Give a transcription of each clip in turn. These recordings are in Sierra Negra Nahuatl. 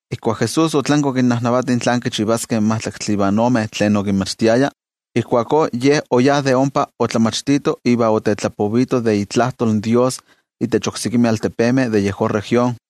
Ijkuak Jesús otlanki okinnajnavati tlán kichivaskeh in majtlaktli ivan ome tlen okinmachtiaya, ijkuakó Ye oyá de ompa otlamachtito iva otetlapovito de itlajtol in Dios itech oksekimeh altepemeh de yejón región.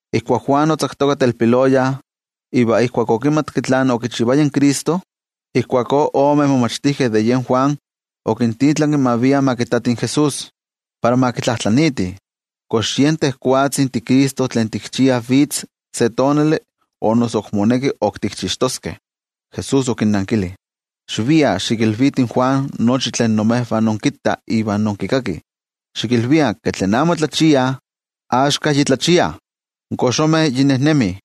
Ijkuak Juan otzaktoka telpiloya iva ijkuak okimatki tlen okichivaya in Cristo, ijkuakó ome momachtijkeh de Juan okintitlanki ma viah ma kittatih in Jesús, para ma kitlajtlaniitih: —¿Kox yen tejwatzi tiCristo tlen tikchiah vitz se tonali, o noso moneki ok tikchixtoskeh? Jesús okinnankili: —Xiviah xikilvitih in Juan nochi tlen imejvah inkittah ivan inkikakih. Xikilvikah ke tlen amo otlachiayah axka yi tlachiah, in koxomeh yi nejnemih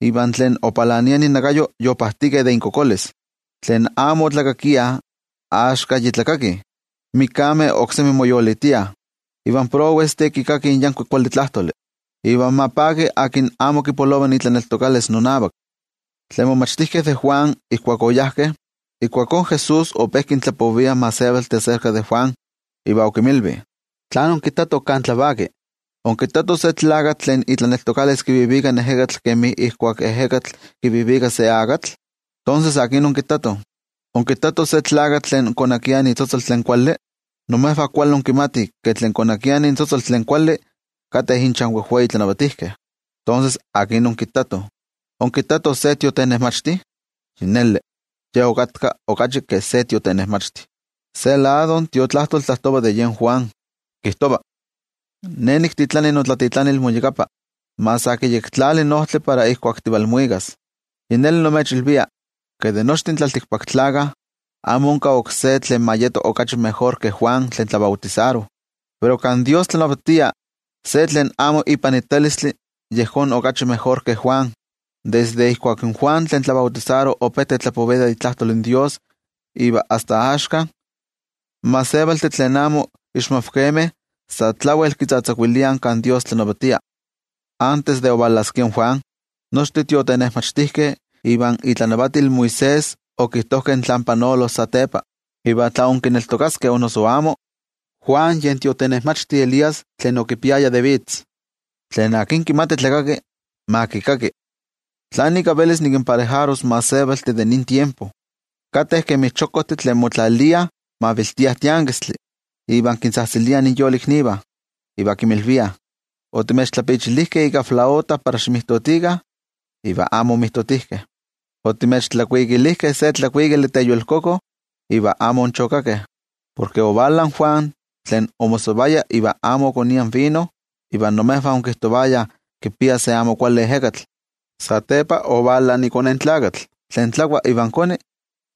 iva tlen opalania innakayo yopajtikeh de inkokolis. Tlen amo otlakakiah, axka yi tlakakih, in mikameh oksemi moyolitiah, iva in prowestih kikakih in yankuik kuali tlajtoli. Iva ma paki tlen amo kipolova itlaneltokalis nonavak. Tlen momachtijkeh de Juan ijkuak oyajkeh, ijkuakó Jesús ope kintlapovia in gentejtih aserka de Juan, iva okinmilvi: —¿Tlán onkittatoh kan tlavaki? ¿Onkittatoh se tlakatl tlen itlaneltokalis kivivika in ejekatl kemi ijkuak in ejekatl kivivika se akatl? ¿Tonses akin onkittatoh? ¿Onkittatoh se tlakatl tlen konakia itzotzol tlen kuali? Imejvah kuali inkimatih ke tlen konakiah intzotzol tlen kuali kateh inchan wejwei tlanavatijkeh. Tonses, ¿akin onkittatoh? ¿Onkittatoh se tiotenejmachti? Yi neli, ye okatka okachi ke se tiotenejmachti. Se lado in Tiotlajkuiloli tlajtova de yen Juan, kijtova: Ne niktitlani notlatitlanil moyakapa, ma sa kiyektlali in ojtli para ijkuak tivalmuikas. Yi neli nimechilvia, ke de nochtin tlaltikpaktlakah, amo onka oksé tlen ma yeto okachi mejor ke Juan tlen tlabautisaro. Pero kan Dios tlanavatia, se tlen amo ipanitalistli yejón okachi mejor ke Juan. ’Desde ijkuak in Juan tlen tlabautisaro ope tetlapovia de itlajtol in Dios iva asta axka, in gentejtih tlen amo ixmavkemeh sa tlawel kitzatzakuiliah kan Dios tlanavatia. Antes de ovalaskia in Juan, nochtin tiotenejmachtijkeh ivan itlanavatil Moisés okijtojkeh tlán panolos satepa. Iva tla inkineltokaskeh o noso amo, Juan yen tiotenejmachti Elías tlen okipiaya de vitz. Tlen kimati tlakaki, ma kikaki. ’¿Tlán ika velis nikinparejaros in gentejtih de nin tiempo? Kateh kemi chokojtih tlen motlaliah maviltiah tiankistli iva kintzajtziliah inyoliknivah, iva kinmilviah: “Otimechtlapichilijkeh ika flauta para ximijtotikah, iva amo onmijtotijkeh. Otimechtlakuikilijkeh se tlakuikali teyolkoko, iva amo onchokakeh.” Porke ovala in Juan, tlen omosavaya iva amo okonia vino, iva imejvah onkijtovayah kipia se amo kuali ejekatl. Satepa ovala iKone in Tlakatl, tlen tlakua iva koni,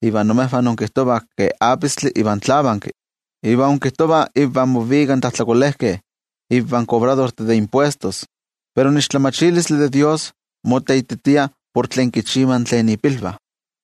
iva imejvah inkijtovah ke apistli iva tlavanki, iva inkijtovah invah movika in tlajtlakolejkeh iva in kobradortih de impuestos. Pero in tlamatilistli de Dios moteititia por tlen kichivah tlen ipilvah.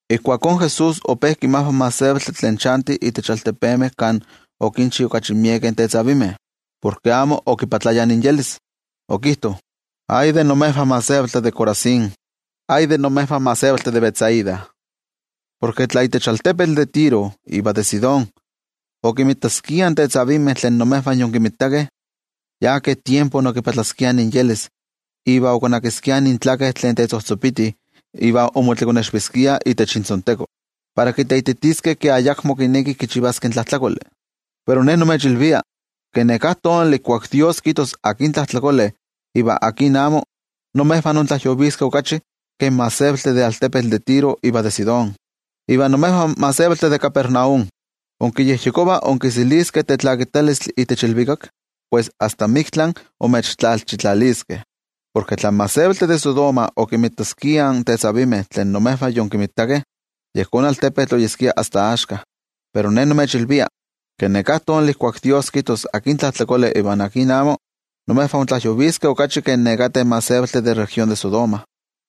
Ijkuakó Jesús ope kinmajva in gentejtih tlen chantih itech altepemeh kan okinchi okachi miekeh tetzavimeh, porke amo omoyolkuapayah. Okijto: —¡Ay de imejvah gentejtih de Corazín! ¡Ay de imejvah gentejtih de Betsaida! Porke tla itech altepetl de Tiro iva de Sidón okinmitaskiah in tetzavimeh tlen imejvah yonkimitakeh, yi ke tiempo yomoyolkopaskiah iva okonakiskiah intzotzol tlen tetzojtzopiti iva omotlekonexviskiah itech intzonteko, para kiteititiskeh ke ayakmo kinekih kichivaskeh tlajtlakoli. Pero Ne nimechilvia, ke neká tonali ijkuak Dios kijtos akin tlajtlakole iva akin amo, imejvah intlajyoviskeh okachi ke in gentejtih de altepetl de Tiro iva de Sidón. Iva imejvah gentejtih de Capernaum, ¿inkiyejyekovah inkiseliskeh tetlakitalistli itech ilvikak? ¡Pues asta miktla imechtlalchitlaliskeh! Porke tla in gentejtih de Sodoma okimitaskiah in tetzavimeh tlen imejvah yonkimitakeh, yejón altepetl oyeskia asta axka. Pero Ne nimechilvia, ke neká tonali ijkuak Dios kijtos akin tlajtlakole iva akin amo, imejvah intlajyoviskeh okachi ke nekateh gentejtih de región de Sodoma.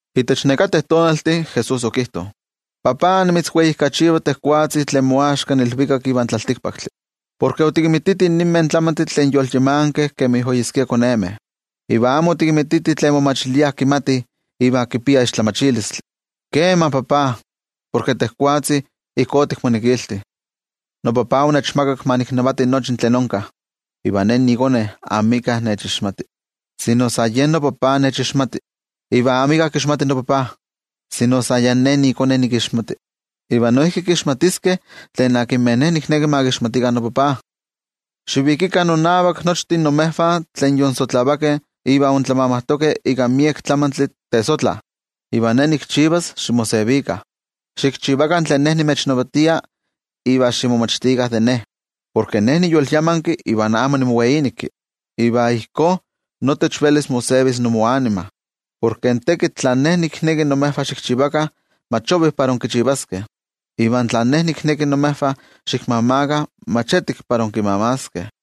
Itech nekateh tonaltih, Jesús okijto: —NoTajtzi, nimitzweijkachiva tejwatzi tlen moaxka in ilvikak ivan tlaltikpaktli. Porke otikinmititih ninmeh tlamantih tlen yolyamankeh kemi oyeskia konemeh, iva amo otikinmititih tlen momachiliah kimatih iva kipiah tlamatilistli. Kema, noTajtzi, porke tejwatzi ijkó otikmonekilti. ’NoTajtzi onechmakak ma niknavati nochi tlen onka. Iva Ne niiKone amika nechixmati, sino san yen noTajtzi nechixmati. Iva amika kixmati noTajtzi, sino san yen Ne niiKone nikixmati. Iva noijki kixmatiskeh tlen akinmeh Ne nikneki ma kixmatikah noTajtzi. Xivikikah nonavak nochtin imejvah tlen yonsotlavakeh iva intlamamajtokeh ika miek tlamantli tesotla, iva Ne nikchivas ximosevikah. Xikchivakah tlen Ne nimechnavatia iva ximomachtikah de Ne, porke Ne niyolyamanki iva amo nimoweíneki. Iva ijkó notech velis mosevis imoanima. Porke in tekitl tlen Ne nikneki imejvah xikchivakah mach ovi para inkichivaskeh, iva tlen Ne nikneki imejvah xikmamakah mach etik para inkimamaskeh.